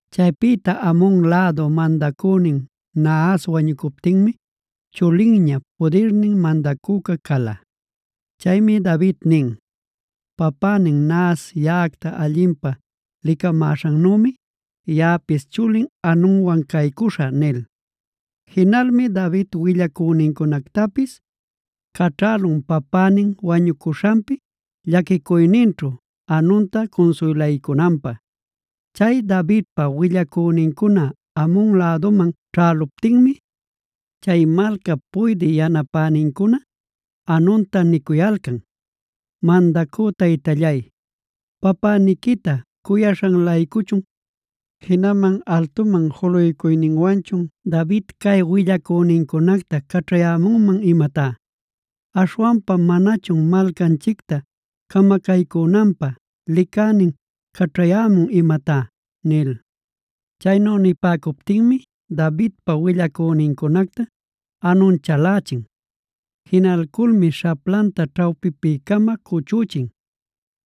Chaypïta Amon lädup mandacünin Nahas wañucuptinmi chulinña, pudirnin mandacüca cala. Chaymi David nin: “Papänin Nahas yaꞌacta allinpä licamäśhannümi yaꞌapis chulin Hanunwan caycuśhä” nil. Jinalmi David willacünincunactapis caćhälun papänin wañucuśhanpi llaquicuyninćhu Hanunta cunsuylaycunanpä. Chay Davidpa willacünincuna Amon läduman ćhäluptinmi, chay malcap puydï yanapänincuna Hanunta nicuyalcan: “Mandacü taytallay, ¿papäniquita cuyaśhan-laycuchun, jinaman altuman juluycuyninwanchun David cay willacünincunacta caćhayämunman imatá? ¿Aśhwanpa manachun malcanchicta camacaycünanpä licänin caćhayämun imatá?” nil. Chaynu nipäcuptinmi Davidpa willacünincunacta Hanun chalächin. Jinalculmi śhaplanta ćhawpipi-cama cuchüchin;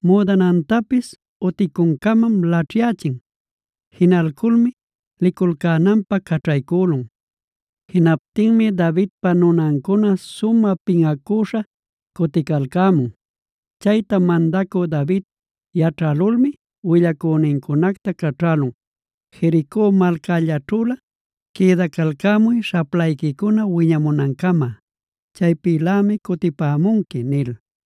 müdanantapis uticuncamam laćhyächin. Jinalculmi liculcänanpä caćhaycülun. Jinaptinmi Davidpa nunancuna sumä pinꞌacüśha cuticalcämun. Chayta mandacü David yaćhälulmi willacünincunacta caćhälun: “Jerico malcällaćhülä quïdacalcämuy śhaplayquicuna wiñamunancama. Chaypïlämi cutipämunqui” nil.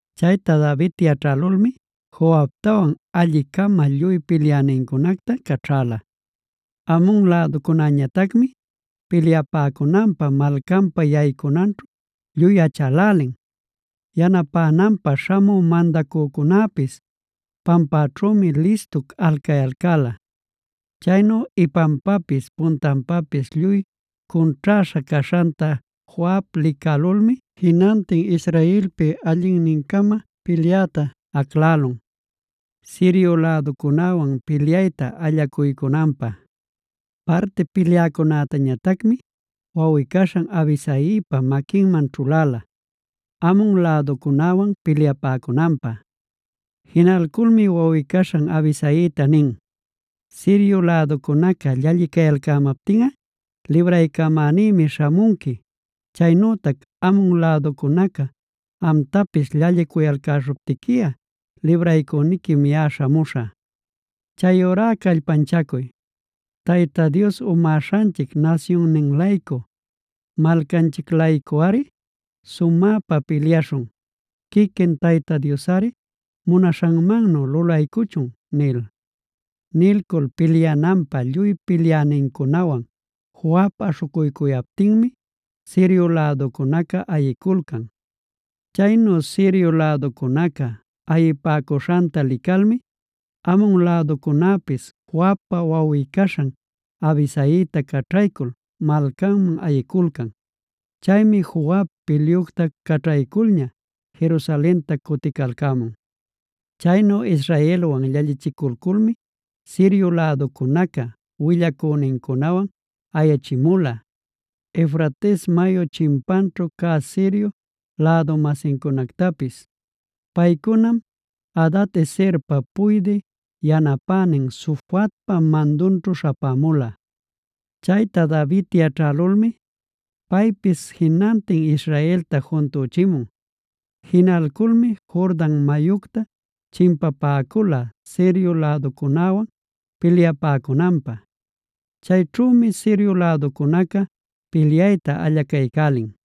Chayta David yaćhälulmi Joabtawan alli-cama lluy pilyänincunacta caćhäla. Amon läducunäñatacmi pilyapäcunanpä malcanpa yaycunanćhu lluy achälälin.a Yanapänanpä śhamü mandacücunäpis pampäćhümi listu alcayalcäla. Chaynu ipanpapis puntanpapis lluy cunćhäśha caśhanta Joab licälulmi jinantin Israelpi allinnin-cama pilyäta aclälun, Sirio läducunäwan pilyayta allacuycunanpä. Parti pilyäcunätañatacmi wawꞌi-caśhan Abisaipa maquinman ćhuläla, Amon läducunäwan pilyapäcunanpä. Jinalculmi wawꞌi-caśhan Abisaita nin: “Sirio läducunaca llallicayalcämaptinꞌa libraycamänïmi śhamunqui. Chaynütac Amon läducunaca amtapis llallicuyalcäśhuptiquiꞌa libraycüniquim yaꞌa śhamuśhä. Chayurá ¡callpanchacuy! ¡Tayta Dios umäśhanchic nasyunnin-laycu, malcanchic-laycuꞌari sumäpa pilyaśhun! Quiquin Tayta Diosꞌari munaśhanmannu lulaycuchun” nil. Nilcul pilyananpä lluy pilyänincunawan Joab aśhucuycuyaptinmi Sirio läducunaca ayiculcan. Chaynu Sirio läducunaca ayipäcuśhanta licalmi, Amon läducunäpis Joabpa wawꞌi-caśhan Abisaita caćhaycul malcanman ayiculcan. Chaymi Joab pilyucta caćhayculña Jerusalenta cuticalcämun. Chaynu Israelwan llallichiculculmi Sirio läducunaca willacünincunawan ayachimula, Eufrates mayup chimpanćhu cä Sirio lädu-masincunactapis. Paycunam Hadad-ezerpa puydï yanapänin Sofacpa mandunćhu śhapämula. Chayta David yaćhälulmi paypis jinantin Israelta juntüchimun. Jinalculmi Jordan mayucta chimpapäcula Sirio läducunäwan pilyapäcunanpä. Chayćhümi Sirio läducunaca pilyayta allacaycälin.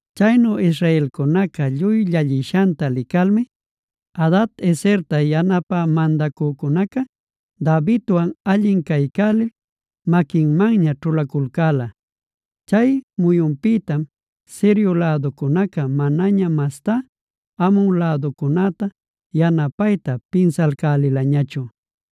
Chaynu israelcunaca lluy llallishanta licalmi. Hadad-ezerta yanapä mandacücunaca Davidwan allin caycälil maquinmanña ćhulaculcäla. Chay muyunpïtam Sirio läducunaca manaña mastá Amon läducunäta yanapayta pinsalcälilañachu.